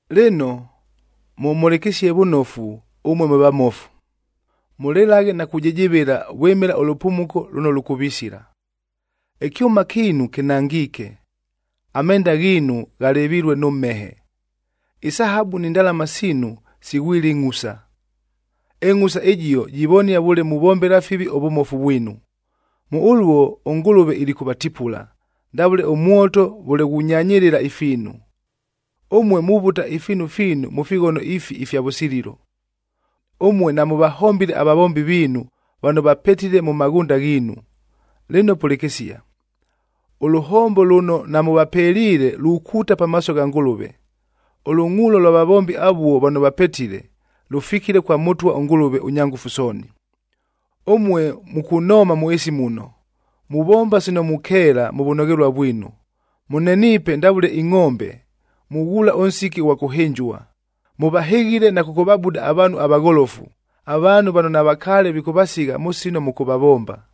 Lɨno, mʉmhʉlɨkɨsie vʉnofu ʉmue mwe vamofu! Mʉlɨlaghe na kujɨjɨvɨla vwɨmɨla ʉlʉpumuko lʉno lʉkʉvisila. Ɨkyʉma kiinu kɨnangiike, amenda ghiinu ghalɨvilue nʉ mhehe. Isahabu ni ndalama siinu sighwile ɨngʼhusa.a Ɨngʼhusa ɨjio jivonia vʉle muvombela fivi ʉvʉmofu vwinu. Mʉ ʉluo ʉNgʉlʉve ilikʉvatipula, ndavʉle ʉmwoto vʉle ghunyanyɨlɨla ifiinu. Ʉmue muvuta ifiinu fiinu mʉ fighono ifi ifya vʉsililo! Ʉmue namʉvahombile avavombi viinu, vano vapetile mʉ maghʉnda ghiinu. Lɨno pʉlɨkɨsia, ʉlʉhombo lʉno namʉvapeliile lukuuta pamaaso gha Ngʉlʉve. Ʉlʉngʼuulo lwa vavombi avuo vano vapetile, lʉfikile kwa Mʉtwa ʉNgʉlʉve ʉNyangʉfu Sooni. Ʉmue mukunooma mʉ ɨɨsi muno, muvomba sino mukeela mʉ vʉnoghelua vwinu, mʉneniipe ndavʉle ingʼombe, mughuula ʉnsiki ʉghwa kʉhɨnjua. Mʉvahɨghile na kʉkʉvabuda avaanhu avagholofu, avaanhu vano navakaale vikʉvasigha mʉ sino mʉkʉvavomba.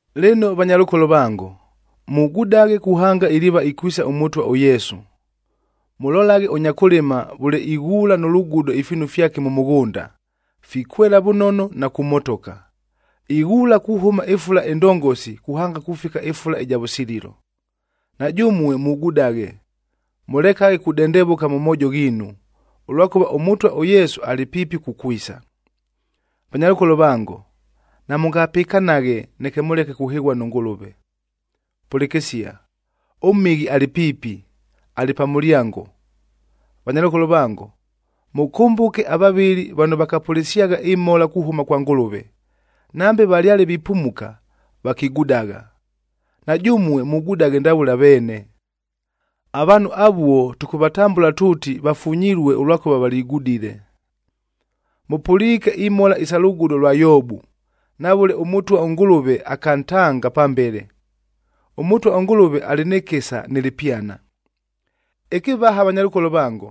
Lɨno vanyalʉkolo vango, mugudaghe kuhanga iliiva ikwisa ʉMʉtwa ʉYesu. Mʉlolaghe ʉnya kʉlɨma vʉle ighuula nʉ lugudo ifiinu fyake mʉ mʉghʉnda, fikwela vʉnono na kumotoka. Ighuula kuhʉma ɨfula ɨndongosi kuhanga kufika ɨfula ɨja vʉsililo. Na jʉmue mugudaghe, mʉlekaghe kudendevʉka mʉ moojo ghiinu, ʉlwakʉva ʉMʉtwa ʉYesu alɨ piipi kukwisa. Vanyalʉkolo vango, namʉngapɨkanaghe neke mʉleke kuhɨghua nʉ Ngʉlʉve. Pʉlɨkɨsia, ʉMhɨghi alɨ piipi, alɨ pa mʉlyango! Vanyalʉkolo vango, mʉkʉmbʉke avavɨli vano vakapʉlɨsyagha ɨmhola kuhʉma kwa Ngʉlʉve! Nambe valyale vipumuka, vakigudagha. Na jʉmue mugudaghe ndavʉle aveene. Avaanhu avuo tʉkʉvatambʉla tuuti vafunyilue ʉlwakʉva valigudile. Mʉpʉliike imhola isa lugudo lwa Yoobu, na vʉle ʉMʉtwa ʉNgʉlʉve akantanga pambele. ɄMʉtwa ʉNgʉlʉve alɨ nɨ kɨsa nɨ lɨpyana. Ɨkɨvaha vanyalʉkolo vango,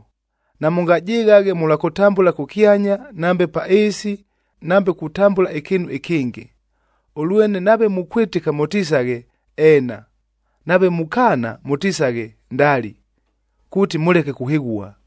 namʉngajɨghaghe mʉlwa kʉtambʉla kʉkyanya nambe pa ɨɨsi nambe kutambʉla ɨkɨɨnu ɨkɨngɨ. Ʉlwene nave mukwɨtɨka mʉtisaghe, “Eena,” nave mukaana mʉtisaghe, “Ndali,” kuuti mʉleke kuhɨghua.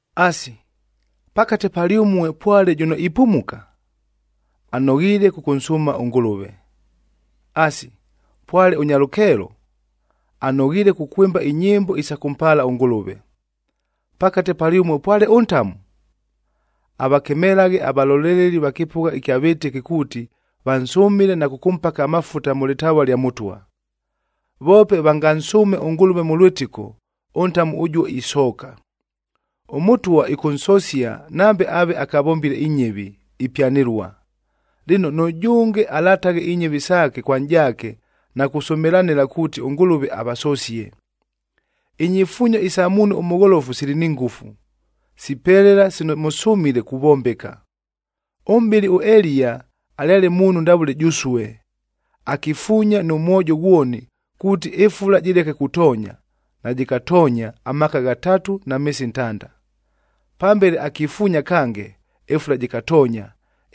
Asi, pakate palyʉmue pwale jʉno ipumuka? Anoghiile kʉkʉnsʉʉma ʉNgʉlʉve. Asi, pwale ʉnya lʉkeelo? Anoghiile kukwɨmba inyɨmbo isa kʉmpaala ʉNgʉlʉve. Pakate palyʉmue pwale ʉntamu? Avakemelaghe avaloleleli va kɨpʉgha ɨkya vɨtɨki kuuti vansʉmɨle na kʉkʉmpaka amafutab mʉ lɨtavua lya Mʉtwa. Voope vangansʉʉme ʉNgʉlʉve mʉ lwɨtɨko, ʉntamu ʉjuo isooka. ɄMʉtwa ɨkʉnsosia nambe aave akavombile inyɨvi, ipyanɨlua. Lɨno, nʉjʉnge alataghe inyɨvi saake kwa nʼjaake na kusʉmɨlanɨla kuuti ʉNgʉlʉve avasosie. Inyifuunyo isa muunhu ʉmʉgholofu sili ni ngʉfu, sipelela sino mʉsʉmile kuvombeka. Ʉmʼbɨli ʉEliya alyale muunhu ndavʉle jʉsue, akifuunya nʉ mwojo ghwoni kuuti ɨfula jɨleke kutoonya, najɨkatoonya amaaka ghatatu na meesi ntanda. Pambele, akifuunya kange, ɨfula jɨkatoonya,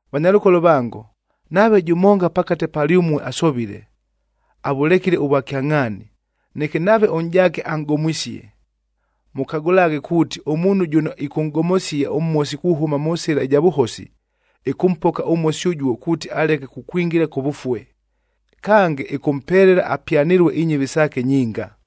Vanyalʉkolo vango, nave jʉmonga pakate palyʉmue asovile, avʉlekile ʉvwakyangʼhaani, neke nave ʉnʼjaake anʼgomwisie, mʉkagʉlaghe kuuti ʉmuunhu jʉno ɨkʉnʼgomosia ʉmhosi kuhʉma mʉ sɨla ɨja vʉhosi, ɨkʉmpoka ʉmhosi ʉjuo kuuti aleke kukwingila kʉvʉfue. Kange, ɨkʉmpelela apyanɨlue inyɨvi saake nyinga.